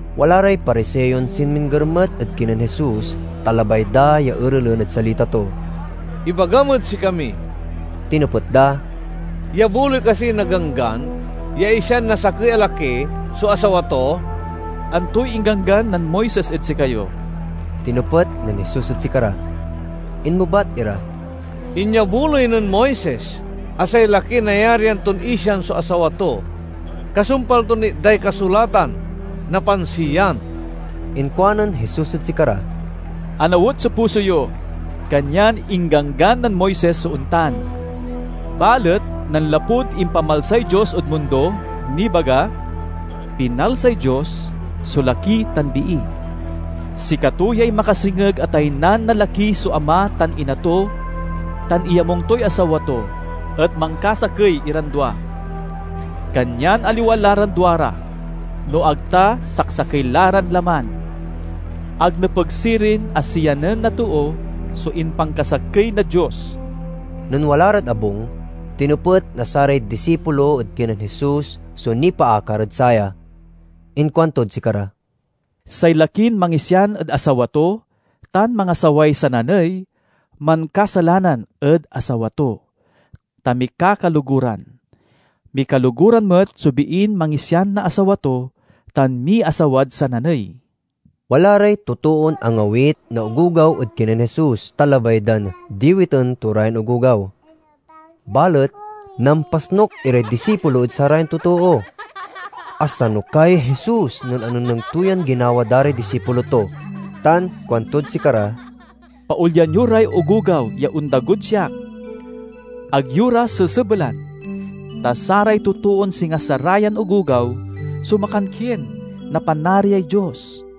Wala ray Pariseon sinmingger met ed kinen Jesus, ta labay da ya erelen ed salita to. "Ibagam ed sikami," tinepet da, "iyabuloy kasi na Ganggan ya isian na sakey a laki so asawa to?" "Antoy ingganggan nen Moises ed sikayo?" tinepet nen Jesus ed sikara. Inmebat ira, "Inyabuloy nen Moises a say laki nayarian ton isian so asawa to, kasumpal ton itday kasulatan na pansiyan." Inkuanen Jesus ed sikara, "Anawet so puso yo, kanyan ingganggan nen Moises so ontan. Balet nanlapud impamalsay Dios ed mundo nibaga, 'Pinalsay Dios so laki tan bii. Sikato yay makasengeg a taynan na laki so ama tan ina to tan iyamung toy asawa to, et mankasakey iran dua.' Kanyan aliwa la ran duara, no ag ta saksakey la ran laman. Ag nepeg sirin a siyanen na too so impankasakey na Dios." Nen wala rad abung tinepet na saray disipulo ed kinen Jesus so nipaakar ed saya. Inkuantod sikara, "Say lakin mangisian ed asawa to tan mangasaway sananey mankasalanan ed asawa to, ta mikakaloguran. Mikaloguran met so biin mangisian na asawa to tan miasawad sananey." Wala ray totoon angawit na ogogaw ed kinen Jesus, ta labay dan diwiten to ra yan ogogaw. Balet nampasnuk iray disipulo ed sarayan totoo. Asanukay Jesus nen anengneng to yan ginawa da ray disipulo to tan kuantod sikara, "Paolyan yo ray ogogaw ya ondagod siak. Ag yo ra sesebelan, ta saray totoon singa sarayan ogogaw so makankien na Panariay Dios.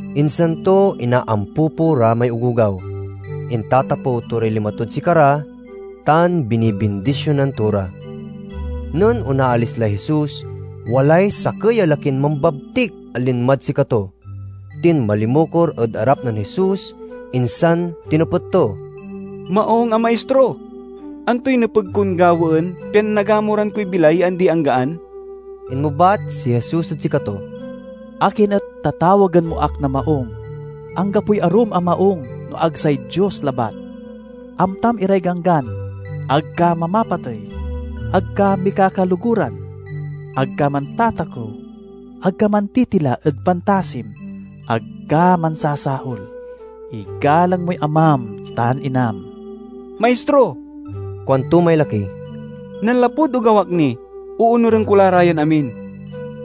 Insan to inaampupo ra may ogogaw, intatapew to ray lima tod sikara, tan binibindisionan to ra. Nen onaalis lay Jesus, walay sakey a lakin mambabtik a linmad sikato. Tinmalimukor ed arap nen Jesus, insan tinepet to, "Maung a Maistro, antoy nepeg kon gawaen pian nagamuran koy bilay ya andi-anggaan?" Inmebat si Jesus ed sikato, "Akin et tatawagen mo ak na maung? Anggapoy arum a maung no ag say Dios labat. Amtam iray ganggan: 'Ag ka mamapatey; ag ka mikakaloguran; ag ka mantatakew; ag ka mantitila ed pantasim; ag ka mansasaol; igalang moy amam tan inam.'" "Maistro," kuanto may laki, "nanlapud ogaw ak ni, oonuren ko la ra yan amin."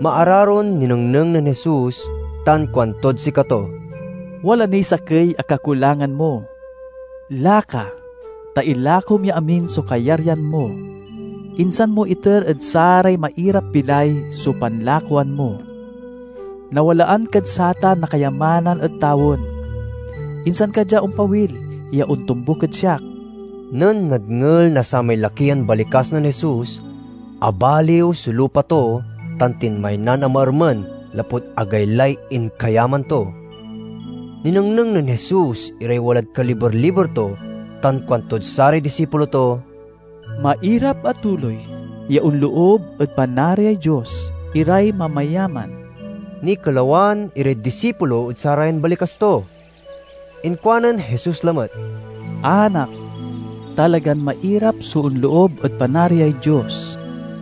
Maararon ninengneng nen Jesus, tan kuantod sikato, "Wala niy sakey a kakulangan mo. Laka, ta ilakom ya amin so kayaryan mo, insan mo iter ed saray mairap-bilay so panlakoan mo. Nawalaan kad satan na kayamanan ed tawen. Insan ka dia ompawil ya ontombuk ed siak." Nen nadngel na samay laki yan balikas nen Jesus, abaliw so lupa to tan tinmaynan a maermen lapud agaylay inkayaman to. Ninengneng nen Jesus iray walad kaliber-liber to tan kuantod saray disipulo to, "Mairap a tuloy ya onloob ed Panariay Dios iray mamayaman!" Nikelawan iray disipulo ed sarayan balikas to. Inkuanen Jesus lamet, "Anak, talagan mairap so onloob ed Panariay Dios.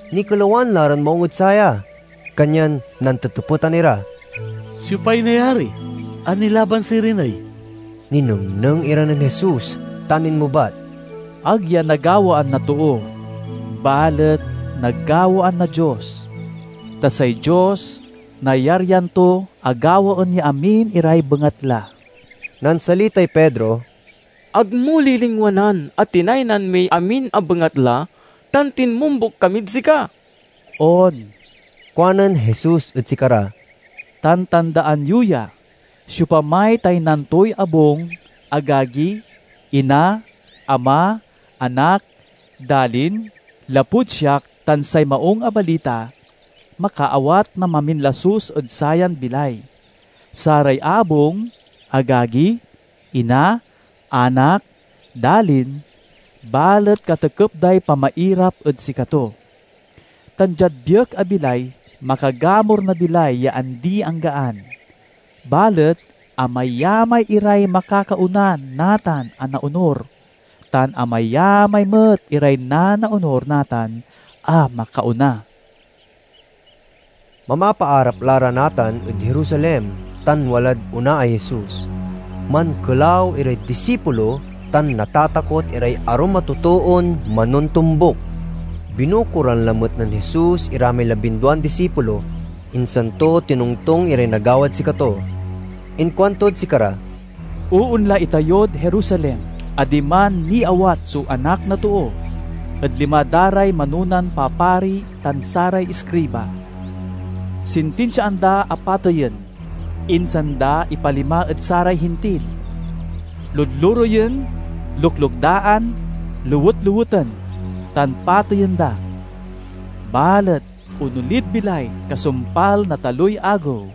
Nikelawan la ran maung ed saya, kanyan nantetepetan ira, "Siopay nayari a nilaban sirin ey?" Ninengneng ira nen Jesus tan inmebat, "Ag ya nagawaan na too, balet nagawaan na Dios, ta say Dios nayaryan to a gawaen ya amin iray bengatla." Nansalitay Pedro, "Ag mo lilingwanan a tinaynan miy amin a bengatla tan tinmombuk kamid sika." "On," kuanen Jesus ed sikara, "tan tandaan yo ya: siopamay taynan toy abung, agagi, ina, ama, anak, dalin, lapud siak tan say Maung a Balita, makaawat na maminlasus ed sayan bilay—saray abung, agagi, ina, anak, dalin—balet katekep day pamairap ed sikato. Tan diad biek a bilay makagamur na bilay ya andi-anggaan. Balet amayamay iray makakaona natan a naonur, tan amayamay met iray nanaonur natan a makaona." Mamapaarap la ra natan ed Jerusalem tan walad onaay Jesus. Mankelaw iray disipulo tan natatakot iray arum a totoon manontombuk. Binukoran lamet nen Jesus ira may labinduan disipulo, insan to tinongtong iray nagawad sikato. Inkuantod sikara, "Oonla itayod Jerusaelm a diman niawat so Anak na Too ed lima da ray manonan papari tan saray iskriba. Sintinsiaan da a pateyen, insan da ipalima ed saray Hintil. Ludlureyen, luklukdaan, lewetleweten, tan pateyen da. Balet onolid bilay kasumpal na taloy agew."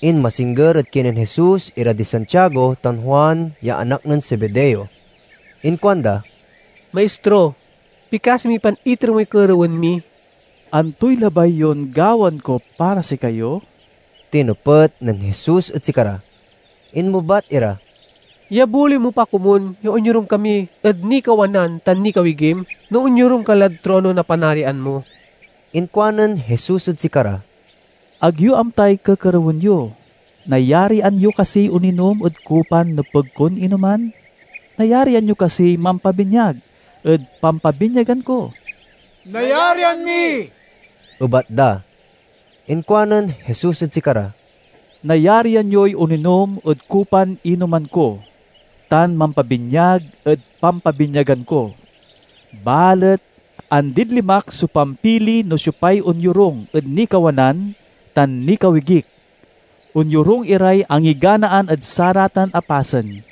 Inmasingger ed kinen Jesus ira di Santiago tan Juan ya anak nen Zebedeo. Inkuanda, "Maistro, pikasi mi pan iter moy kerewen mi." "Antoy labay yon gawaen ko para sikayo?" tinepet nen Jesus ed sikara. Inmebat ira, "Iyabuloy mo pa komun ya onyorung kami ed nikawanan tan nikawigim, no onyorung ka lad trono na Panarian mo." Inkuanen Jesus ed sikara, "Ag yo amtay kekerewen yo. Nayarian yo kasiy oninom ed kupan nepeg kon inoman? Nayarian yo kasiy mampabinyag ed pampabinyagan ko?" "Nayarian mi," ebat da. Inkuanen Jesus ed sikara, "Nayarian yoy oninom ed kupan inoman ko tan mampabinyag ed pampabinyagan ko, balet andid limak so pampili no siopay onyorung ed nikawanan tan nikawigik. Onyorung iray angiganaan ed saratan a pasen."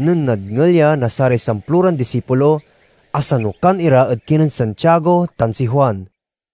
Nen nadngel ya na saray samploran disipulo, asanukan ira ed kinen Santiago tan si Juan.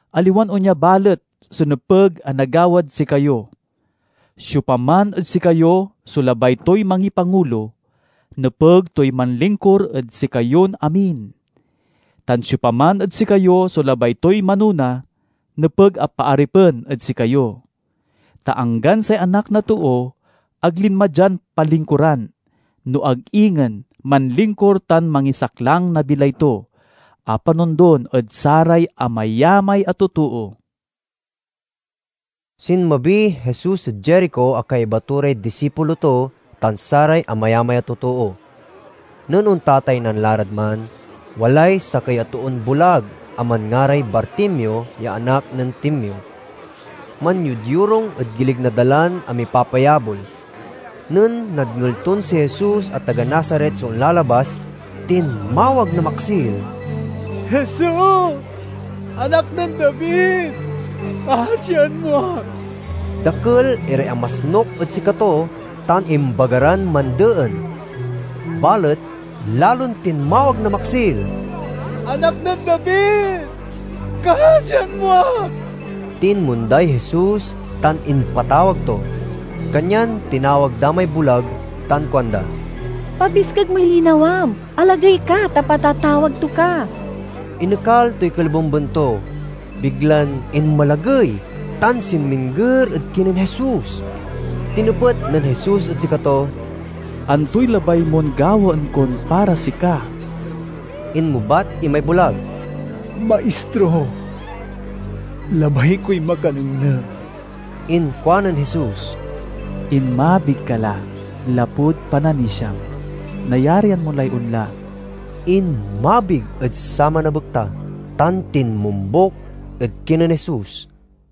Aliwan onya balet so nepeg a nagawad sikayo. Siopaman ed sikayo so labay toy mangipangulo, nepeg toy manlingkur ed sikayon amin. Tan siopaman ed sikayo so labay toy manona, nepeg a paaripen ed sikayo. Ta anggan say Anak na Too ag linma dian palingkuran, no ag ingen manlingkur tan mangisaklang na bilay to, a panondon ed saray amayamay a totoo." Sinmabiy Jesus ed Jerico a kaiba to ray disipulo to tan saray amayamay a totoo. Nen ontataynan la rad man, walay sakey a toon bulag a manngaray Bartimeo ya anak nen Timeo. Manyodyorung ed gilig na dalan a mipapayabol. Nen nadngel ton si Jesus a taga Nazaret so onlalabas, tinmawag na maksil, "Jesus, Anak nen David! Kasian mo ak!" Dakel iray amasnuk ed sikato tan imbaga ran mandeen, balet lalon tinmawag na maksil, "Anak nen David, kasian mo ak!" Tinmonday Jesus tan impatawag to. Kanyan tinawag da may bulag tan kuanda, "Pabiskeg moy linawam. Alagey ka, ta patatawag to ka." Inekal toy kolibemben to, biglan inmalagey, tan sinmingger ed kinen Jesus. Tinepet nen Jesus ed sikato, "Antoy labay mon gawaen kon para sika?" Inmebat imay bulag, "Maistro, labay koy makanengneng." Inkuanen Jesus, "Inmabig ka la, lapud pananisiam. Nayarian mo lay onla." Inmabig ed saman a bekta tan tinmombuk ed kinen Jesus.